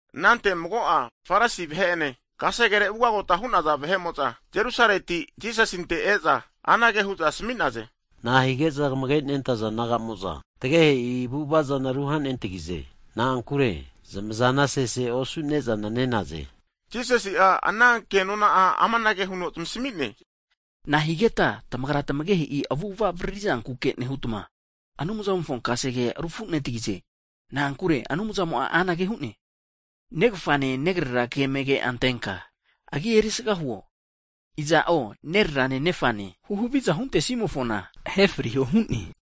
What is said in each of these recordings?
Anante mago'a Farisi vahe'ene kasegere ugagota hu'naza vahe'mo'za Jerusaleti, Jisasinte e'za anage hu'za asmi'naze. Na'a hige'za kamage nentaza disaipol naga'mo'za tagehe'i avu'ava zana ruhanentagize? Na'ankure zamazana sese osu ne'zana ne'naze. Jisasi'a ana ke nona'a, amanage huno zamasmi'ne, Nahigeta tamagra tamagehe'i avu'ava avriri zankuke nehutma, Anumzamofo kasegea rufunetagize? Na'ankure, Anumzamo'a anage hu'ne, Negafane, negrera ke amage antenka zanagi erisaga huo, iza'o nererano, nefano huhaviza huntesimofona ahe friho hu'ne.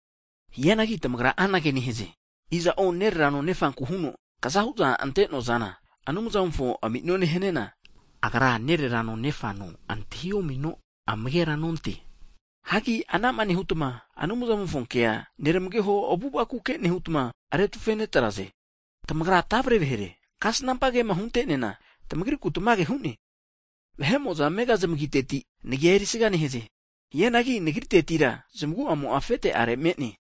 Hianagi tamagra anage nehaze, iza'o nererano nefanku huno, kazahu'za ante'noa zana Anumzamofo ami'none haniana, agra nererano nefana antahi omino amagera nonte. Hagi anama nehutma Anumzamofo kea, nermageho avu'avakuke nehutma retufe netraze. Tamagra tavre vahere, Aisaia'ma kasnampa kema hunte'neana tamagriku tamage hu'ne, Ama vahe'mo'za amega zamagiteti Nagia erisaga nehaze. Hianagi nagritetira zamagu'amo'a afete'are me'ne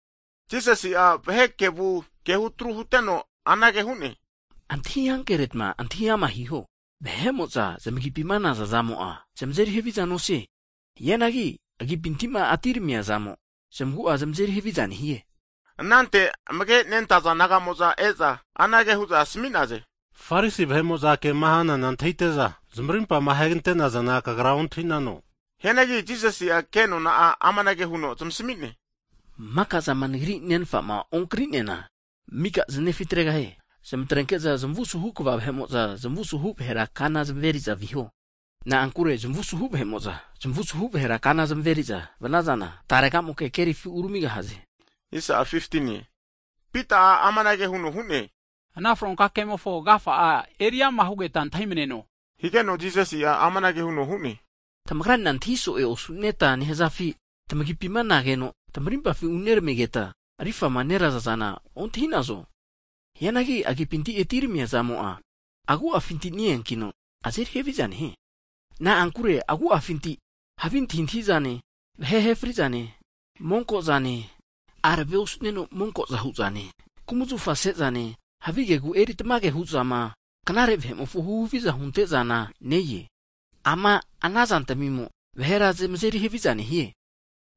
Jisasi'a vahe kevu kehutru huteno anage hu'ne, Antahi ankeretma antahi ama hiho. Vahe'mo'za zamagipima nazazamo'a zamazeri haviza nosie. Hianagi zamagipinti'ma atiramia zamo zamagu'a zamazeri haviza nehie. Anante amage nentaza disaipol naga'mo'za e'za, anage hu'za asmi'naze, Farisi vahe'mo'za kema hana antahite'za zmarimpama ahegante'nazana Kagra antahi'nano? Hianagi Jisasi'a kenona'a amanage huno zamasmi'ne, maka'zama Nagri Nenfama onkri'neana, mika zanefi tregahie. Zamatrenke'za zamu suhu kva vahe'mo'za, zamusuhu vahera kana zameri'za viho. Na'ankure zamavu suhu vahe'mo'za, zamavu suhu vahera kana zameri'za vanazana, taregamoke kerifi uramigaha'e. Hianagi Pita'a amanage huno hu'ne, ana fronka kemofo agafa'a eriama hugeta antahi maneno higeno, Jisasi'a amanage huno hu'ne, Tamagranena antahi so'e osu'neta nehazafi? Tamagipima nageno tamarimpafi uneramigeta arifama neraza'zana ontahi'nazo? Hianagi agipinti atiramia zamo'a agu'afinti neankino, azeri haviza nehie. Na'ankure agu'afinti havi antahintahizane, vahe ahe fri'zane, monko'zane, arave osu'neno monko'za hu'zane, kumzafa sezane, havigegu eri tamage hu'zama, knare vahe'mofo huhaviza hunte'zana ne-e. Ama'na zantamimo vahera zamazeri haviza nehie.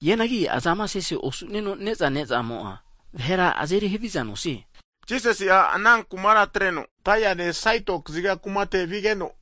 Hianagi azama sese osu'neno ne'za nezamo'a, vahera azeri havizana nosie. Anantetira Jisasi'a ana kumara atreno, Tairine Saitoni kumate vigeno,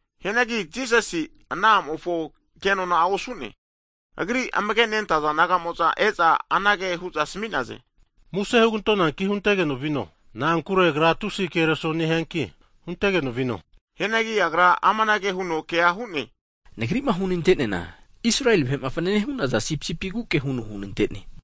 Hianagi Jisasi'a ana a'mofo kenona osu'ne. Agri amage nentaza disaipol naga'mo'za e'za anage hu'za asami'naze. Muse hugantonanki huntegeno vino, na'ankure agra tusi kereso nehianki huntegeno vino. Hianagi Agra amanage huno kea hu'ne, Nagri'ma hunante'neana Israel vahe'ma fanane hu'naza sipisipiguke huno hunante'ne.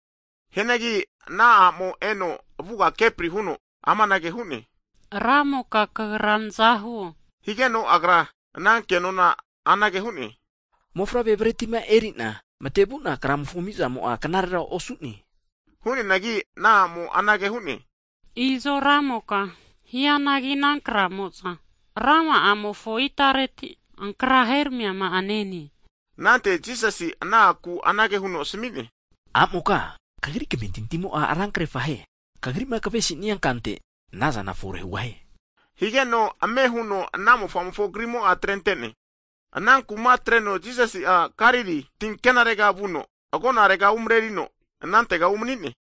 Hianagi ana a'mo'a eno Jisasi avuga kepri huno amanage hu'ne, Ramoka Kagra naza huo! Higeno Agra ana kenona anage hu'ne, Mofavre bretima eri'na matevu'na kraramimofo ami'zamo'a knarera osu'ne. Hu'neanagi ana a'mo'a anage hu'ne, izo Ramoka, hianagi ana kramoza razmimofo itareti ankra heramiama'a nenaze. Anante Jisasi ana a'kura anage huno asmi'ne, A'moka, Kagri kamentintimo'a ra krefahie, kagrima kavesinia kante anazana fore hugahie. Higeno, ame huno ana mofa'amofo krimo'a atrente'ne. Hagi ana kuma atreno Jisasi'a Galili tinkenarega vuno, agonarega umrerino anantega umani'ne.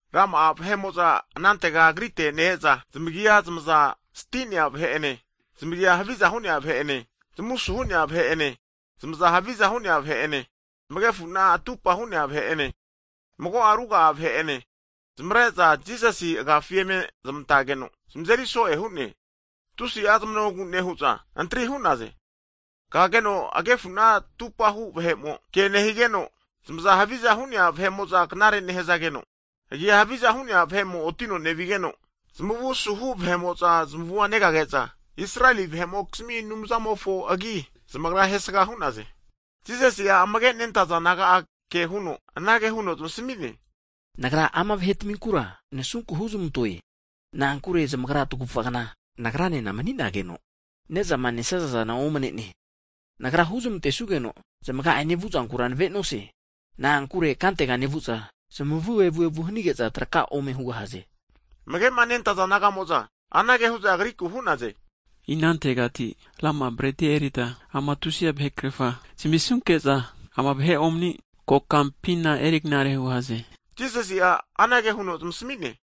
Rama'a vahe'mo'za anantega Agrite ne-eza, zamagia zamaza sti'nea vahe'ene, zamagia haviza hu'nea vahe'ene, zamu suhu'nea vahe'ene, zamazama haviza hu'nea vahe'ene, zamagefuna atupa hu'nea vahe'ene, mago'a ruga'a vahe'ene zamare'za Jisasi agafi eme zmantageno zamazeri so'e hu'ne. Tusi'a zmanogu nehu'za antri hu'naze. Kageno agefuna atupahu vahe'mo ke nehigeno, zamaza haviza hu'nea vahe'mo'za knare nehazageno, agia havizahu vahe'mo otino nevigeno, zamavu asuhu vahe'mo'za zamavua negage'za, Israeli vahe'mokizmi Anumzamofo agi zamagra ahentesga hu'naze. Jisasi'a amage nentaza disaipol naga'a ke huno anage huno zamasmi'ne, Nagra ama vahetaminkura nasunku huzmantoe, na'ankure zamagra tagufa kna Nagranena mani'nageno nezama nesazazana omne'ne. Nagrama huzmantesuge'za zamaga ene vuzankura navenosie. Na'ankure kantega nevu'za zamavu evu evu hanige'za traka ome hugahaze. Amage'ma nentaza disaipol naga'mo'za anage hu'za Agriku hu'naze, Inantegati rama'a bretia erita ama tusi vahe krerfa zmisunke'za, ama vahe omani kokampina erignare hugahaze? Jisasi'a anage huno zamasmi'ne,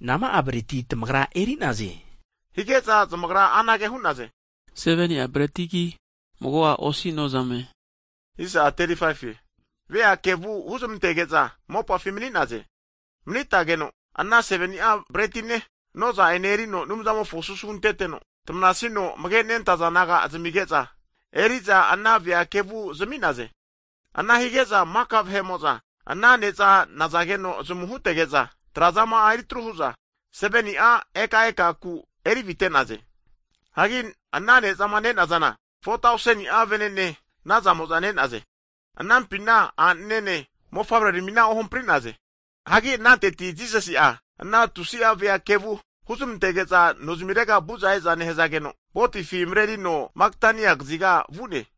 Nama'a breti tamagra eri'naze? Hige'za zamagra anage hu'naze, 7ni'a bretigi, mago'a osi nozamerame. Ana huteno vea kevua huzmantege'za mopafi mani'naze. Manitageno ana 7ni'a bretine noza'ene erino Anumza'mofo susu hunteteno, tmanasino amage nentaza disaipol naga'a zamige'za eri'za ana vea kevu zami'naze. Ana hige'za maka vahe'mo'za ana neza nazageno zamu hutege'za, atrazama'a eri atru hu'za 7ni'a ekaeka kupi eri avite'naze. Hagi ana nezama ne'nazana 4tauseni'a vene'ne nazamo'za ne'naze. Anampina a'nene, mofavre'ramina ohampri'naze. Hagi ananteti Jisasi'a, ana tusi'a vea kevu huzmantege'za nozimirega vu'za e'za nehazageno, votifi marerino Magadani kaziga vu'ne.